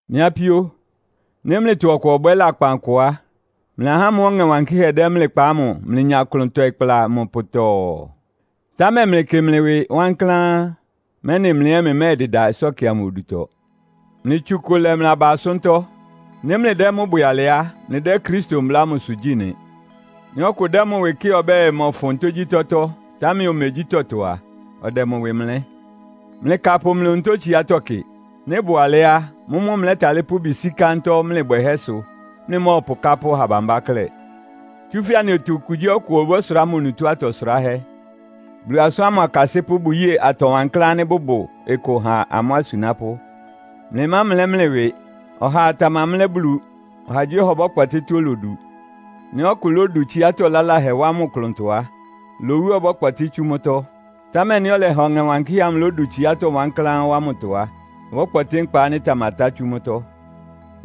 Mɩ́ apíó, nɩ́ mlɩtɔ ɔkʋ ɔbwɛ́ lakpan kʋ á, mlɩ ahá ámʋ́ʋ́ Ɔŋɛ Wankɩ́hɛ́ dɛ mlɩ kpa ámʋ mlɩnya klʋn tɔɩ kpla mʋ pʋtɔɔ. Támɛ mlɩkɩ mlɩ ɩwɩ wankláán, mɛ́nɩ mlɩ ɛ́ mlɩmɛ́ɛdɩda ɩsɔ́kɩ amʋ odutɔ. Mlɩtsu ɩkʋ lɛ mlɩ aba asʋ́ntɔ́. Nɩ́ mlɩdɛ́ mʋ́ bwɛ alɩ á, mlɩdɛ́ Kristo mbla ámʋsʋ gyí nɩ. Nɩ́ ɔkʋ dɛ́ mʋ ɩwɩ kɩ́ɩ ɔbɛ́ɛ mɔfʋn tógyítɔ́tɔ́, támɛ omegyí tɔtɔ a, ɔdɛ mʋ ɩwɩ mlɛ́. Mlɩkapʋ mlɩ onutó tsiátɔ́ kɩ. Nɩ́ ɩbʋ alɛ́ á, mʋ́mʋ́ mlɛ́talɩ́ pʋ́ ɩbɩ sí kántɔ́ mlɩ bwɛhɛ́ sʋ, mlɩmɔ́ɔpʋ kápʋ́ ɔha bambá klɛ́. Tsúfɛ́ anɩtɔ okugyíɔkʋ ɔbɔ́sʋrá mʋ onutó atɔ sʋráhɛ́. Bulu asʋ́n ámʋ akasɩ́pʋ́ bʋyée atɔ wankláán ánɩ́ bʋbʋ ɩkʋ ha amʋ́ asunápʋ́. Mlɩmámlɛ́ mlɩ ɩwɩ. Ɔhaa tamamlɛ́ Bulu. Ɔhagyíɔha ɔbɔ́kpɔtɩ́ tɔ́á olodu. Nɩ́ ɔkʋ lódu tsiátɔ́ laláhɛ wá mʋ klʋntɔ á, lowu ɔbɔ́kpɔtɩ́ tsú mʋ́tɔ́. Támɛ nɩ́ ɔlɛha Ɔŋɛ Wankɩ́hɛ́ amʋ lódu tsiátɔ́ wankláán wá mʋ klʋntɔ á, ɔbɔ́kpɔtɩ́ nkpa ánɩ́ ɩtamatá tsú mʋ́tɔ́.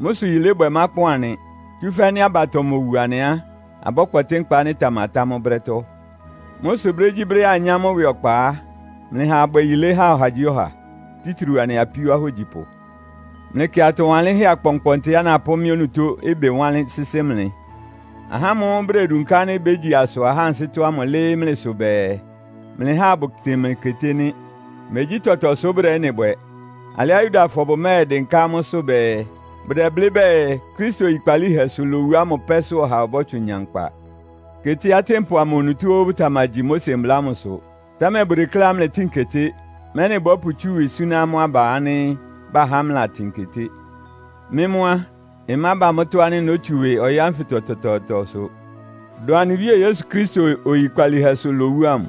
Mʋ́ sʋ yilébwɛ mákpɔn anɩ, tsúfɛ́ nɩ́ abatɔ mowu anɩ á, abɔ́kpɔtɩ́ nkpa ánɩ́ ɩtamatá mʋ́ brɛ́tɔ́. Mʋ́ sʋ brégyíbrɛ́á anyá mʋ́ ɩwɩ ɔkpa á, mlɩha abwɛ yilé ha ɔhagyíɔha, títriu anɩ apíó ahógyipʋ. Mlɩkɩ atɔ wanlɩ́nhɛ́ akpɔnkpɔntɩá napʋ́ mɩ́ onutó ɩbɩ wánlɩ́n sɩ́sɩ́ mlɩ! Ahá ámʋ́ʋ́ bʋdedunká ánɩ́ bégyi asʋ ahá ansɩ́tɔ́ ámʋ lɩ́ɩ́ mlɩsʋ bɛɛ, mlɩháa abʋtɩn mlɩ keté nɩ́. Megyí tɔtɔ sʋ́ bʋdɛ ɩ́nɩ bwɛ. Alɩá Yudafɔ bʋmɛ́ɛdɩnká amʋ́sʋ́ bɛɛ, bʋdɛblɩ́ bɛɛ Kristo oyikpalíhɛsʋ lowu ámʋ pɛ́sʋ́ ɔha ɔbɔ́tsʋn nya nkpa. Keté atɩ́npʋ amʋ onutó óó bʋtamagyi Mose mbla ámʋsʋ. Támɛ bʋdekléá mlɩtɩ́ɩn keté, mɛ́nɩ bɔ́pʋtsú ɩwɩ súná amʋ́ aba ánɩ́ bahá mlɩlatɩn keté. Mɩ́ mʋ́ á, ɩmába mʋ́tɔ́ ánɩ́ nótsu ɩwɩ ɔyɩ́ ánfɩtɔ tɔtɔɔtɔsʋ, dʋn anɩ Wíe Yesu Kristo oyikpalíhɛsʋ lowu ámʋ.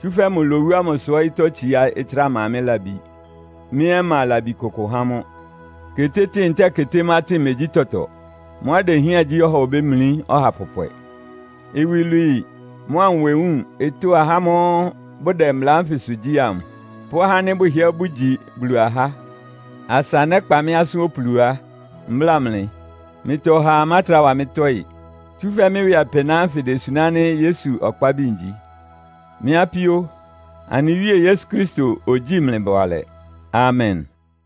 Tsúfɛ́ mʋ lowu ámʋ sʋ ɔyɩ́tɔ́ tsiá ɩtráa ma mɩ́ labi, mɩ́ ɛ́ mma labi kʋkʋ há mʋ́. Ketétɩ́ɩn ntɛ́ɛ ketémátɩn megyí tɔtɔ. Mʋ́á idehián gyí ɔha obémlí ɔha pɔpwɛ. Iwilwii mʋ́a nwewúun ɩtʋ́ ahá ámʋ́ʋ́ bʋdɛ mbla ánfɩsʋ gyí amʋ, pʋ́ ahá ánɩ́ bʋhɩ́ɛ́ bʋgyi Bulu ahá! Asa nɛ́kpa mɩ́ asʋ́n opulu á, mbláa mlɩ. Mlɩtɔ ɔhaa mátrá wa mɩ́ tɔ́ɩ. Tsúfɛ́ mɩ́ ɩwɩ apɩná ánfɩ idesuná ánɩ́ Yesu ɔkpábi ngyi. Mɩ́ apíó, anɩ Wíe Yesu Kristo ogyíi mlɩ bʋalɛ. Amen!